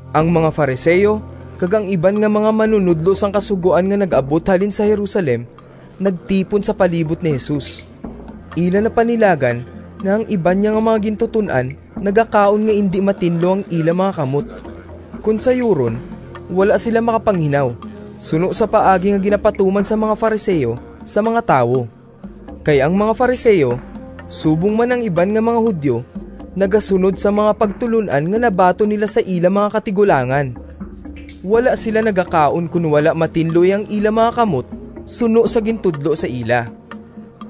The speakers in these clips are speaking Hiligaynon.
Ang mga Fariseo kag ang iban nga mga manunodlo sang Kasugoan nga nag-abot halin sa Jerusalem nagtipon sa palibot ni Jesus. Ila napanilagan nga ang iban niya nga mga gintuton-an nagakaon nga indi matinlo ang ila mga kamot, kon sayuron, wala sila makapanghinaw suno sa paagi nga ginapatuman sang mga Fariseo sa mga tawo. Kay ang mga Fariseo, subong man ang iban nga mga Judio, nagasunod sang mga pagtulon-an nga nabaton nila sa ila mga katigulangan. Wala sila nagakaon kon wala matinloi ang ila mga kamot suno sa gintudlo sa ila.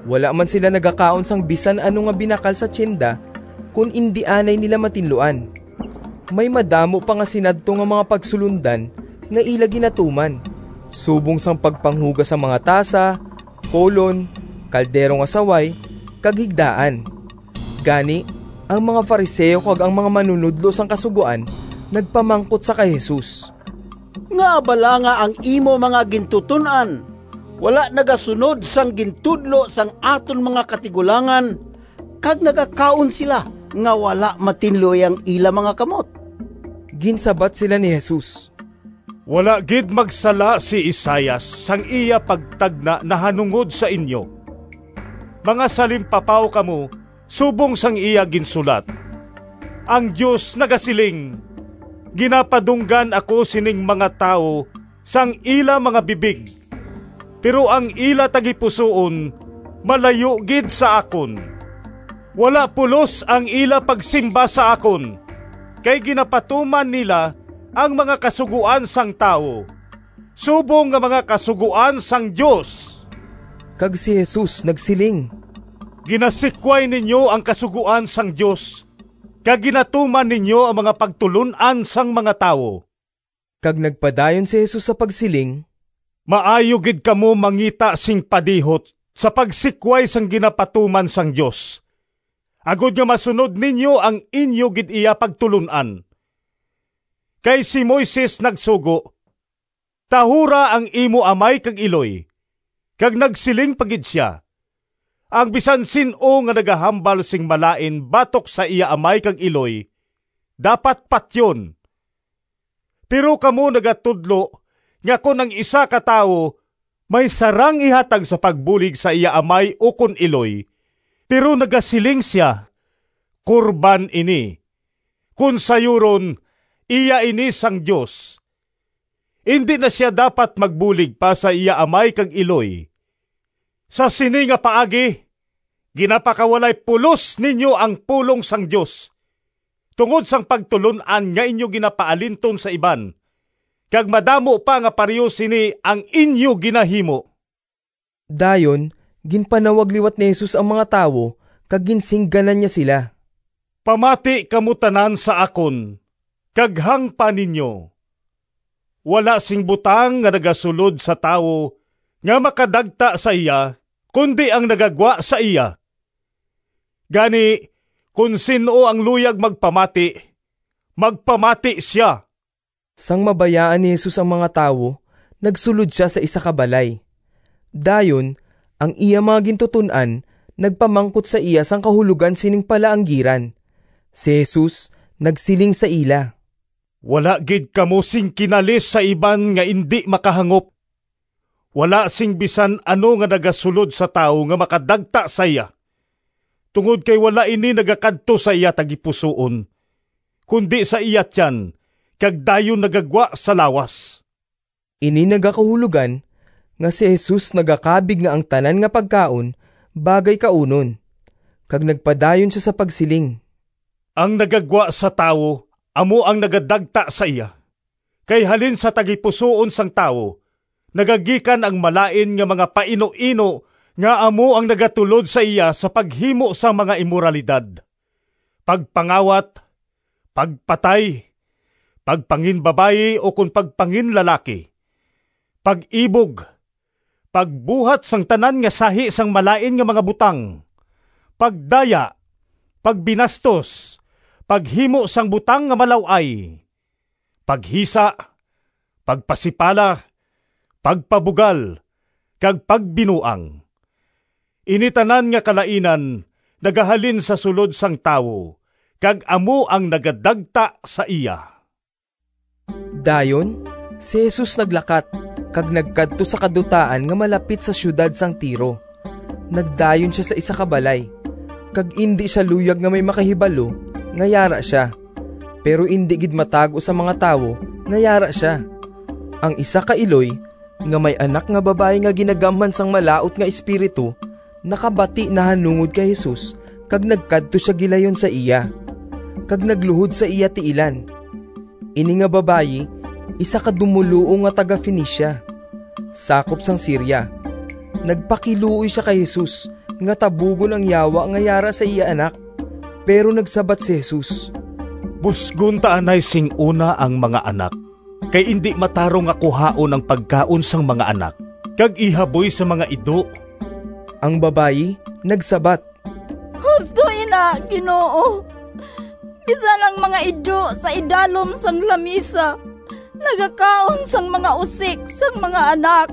Wala man sila nagakaon sang bisan ano nga binakal sa tiyenda kon indi anay nila matinloan. May madamo pa nga sinadto nga mga pagsulondan nga ila ginatuman subong sang pagpanghugas sang mga tasa, kolon, kaldero nga saway, kag higdaan. Gani ang mga Fariseo kag ang mga manunodlo sang Kasugoan nagpamangkot sa kay Jesus, “Ngaa bala nga ang imo mga gintuton-an wala nagasunod sang gintudlo sang aton mga katigulangan kag nagakaon sila nga wala matinloi ang ila mga kamot?” Ginsabat sila ni Jesus, “Wala gid magsala si Isaias sang iya pagtagna nahanungod sa inyo. Mga salimpapaw kamo subong sang iya ginsulat: ‘Ang Dios nagasiling, Ginapadunggan ako sining mga tawo Sang ila mga bibig, Pero ang ila tagipusoon Malayo gid sa akon. Wala pulos ang ila pagsimba sa akon, Kay ginapatuman nila Ang mga kasugoan sang tawo Subong nga mga kasugoan sang Dios!’” Kag si Jesus nagsiling, “Ginasikway ninyo ang kasugoan sang Dios kag ginatuman ninyo ang mga pagtulon-an sang mga tawo.” Kag nagpadayon si Jesus sa pagsiling, “Maayo gid kamo mangita sing padihot sa pagsikway sang ginapatuman sang Dios agod nga masunod ninyo ang inyo gid iya pagtulon-an! Kay si Moises nagsugo, ‘Tahura ang imo amay kag iloy,’ kag nagsiling pa gid sia, ‘Ang bisan sin-o nga nagahambal sing malain batok sa iya amay kag iloy dapat patyon.’ Pero kamo nagatudlo nga kon ang isa ka tawo may sarang ihatag sa pagbulig sa iya amay ukon iloy, pero nagasiling sia, ‘Korban ini’ (kon sayuron, iya ini sang Dios), indi na sia dapat magbulig pa sa iya amay kag iloy. Sa sini nga paagi ginapakawalay pulos ninyo ang pulong sang Dios tungod sang pagtulon-an nga inyo ginapaalinton sa iban. Kag madamo pa nga pareho sini ang inyo ginahimo.” Dayon ginpanawag liwat ni Jesus ang mga tawo kag ginsingganan niya sila, “Pamati kamo tanan sa akon, kag hangpa ninyo. Wala sing butang nga nagasulod sa tawo nga makadagta sa iya, kundi ang nagagwa sa iya. [ Gani, kon sin-o ang luyag magpamati, magpamati sia!]” Sang mabayaan ni Jesus ang mga tawo nagsulod sia sa isa ka balay. Dayon ang iya mga gintuton-an nagpamangkot sa iya sang kahulogan sining palaanggiran. Si Jesus nagsiling sa ila, “Wala gid kamo sing kinalis sa iban nga indi makahangop! Wala sing bisan ano nga nagasulod sa tawo nga makadagta sa iya, tungod kay wala ini nagakadto sa iya tagipusoon kundi sa iya tiyan kag dayon nagagwa sa lawas.” (Ini nagakahulogan nga si Jesus nagakabig nga ang tanan nga pagkaon bagay kaunon.) Kag nagpadayon sia sa pagsiling, “Ang nagagwa sa tawo amo ang nagadagta sa iya. Kay halin sa tagipusoon sang tawo nagagikan ang malain nga mga painuino nga amo ang nagatulod sa iya sa paghimo sang mga imoralidad, pagpangawat, pagpatay, pagpanginbabayi ukon pagpanginlalaki, pag-ibog, pagbuhat sang tanan nga sahi sang malain nga mga butang, pagdaya, pagbinastos, paghimo sang butang nga malaw-ay, paghisa, pagpasipala, pagpabugal, kag pagbinuang. Ini tanan nga kalainan nagahalin sa sulod sang tawo kag amo ang nagadagta sa iya.” Dayon si Jesus naglakat kag nagkadto sa kadutaan nga malapit sa siyudad sang Tiro. Nagdayon sia sa isa ka balay, kag indi sia luyag nga may makahibalo nga yara sia, pero indi gid matago sa mga tawo nga yara sia. Ang isa ka iloy nga may anak nga babayi nga ginagamhan sang malaut nga espiritu, nakabati nahanungod kay Jesus kag nagkadto sia gilayon sa iya, kag nagluhod sa iya tiilan. Ini nga babayi isa ka dumoluong nga taga-Fenicia, sakop sang Siria. Nagpakiluoy sia kay Jesus nga tabugon ang yawa nga yara sa iya anak. Pero nagsabat si Jesus, “Busgon ta anay sing una ang mga anak, kay indi matarong nga kuhaon ang pagkaon sang mga anak kag ihaboy sa mga ido.” Ang babayi nagsabat, “Husto ina, Ginoo, bisan ang mga ido sa idalom sang lamisa nagakaon sang mga usik sang mga anak!”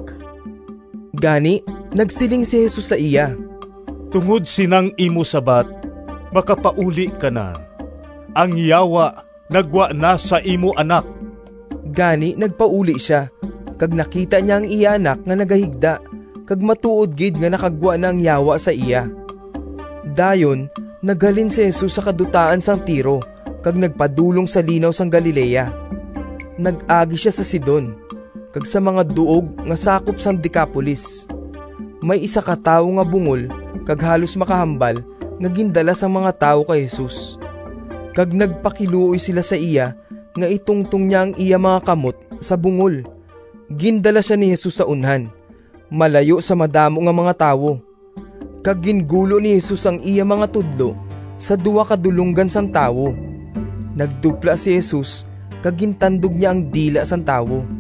Gani nagsiling si Jesus sa iya, “Tungod sinang imo sabat, makapauli ka na, ang yawa naggwa na sa imo anak!” Gani nagpauli sia kag nakita niya ang iya anak nga nagahigda kag matuod gid nga nakagwa na ang yawa sa iya. Dayon naghalin si Jesus sa kadutaan sang Tiro kag nagpadulong sa Linaw sang Galilea. Nag-agi sia sa Sidon kag sa mga duog nga sakop sang Decapolis. May isa ka tawo nga bungol kag halos makahambal nga gindala sang mga tawo kay Jesus, kag nagpakiluoy sila sa iya nga itungtong niya ang iya mga kamot sa bungol. Gindala sia ni Jesus sa unhan malayo sa madamo nga mga tawo, kag gingulo ni Jesus ang iya mga tudlo sa duha ka du longgan sang tawo, nagdupla si Jesus kag gintandog niya ang dila sang tawo.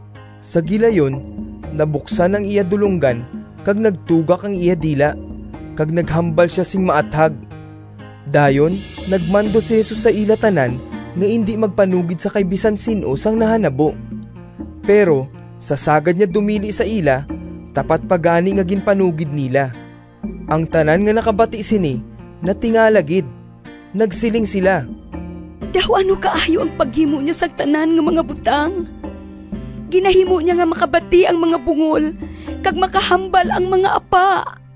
Sa gilayon nabuksan ang iya dulonggan kag nagtugak ang iya dila, kag naghambal sia sing maathag. Dayon nagmando si Jesus sa ila tanan nga indi magpanugid sa kay bisan sin-o sang nahanabo, pero sa sagad niya dumili sa ila tapat pa gani nga ginpanugid nila. Ang tanan nga nakabati sini natingala gid. Nagsiling sila, “Daw ano kaayo ang paghimo niya sang tanan nga mga butang. Ginahimo niya nga makabati ang mga bungol kag makahambal ang mga apa!”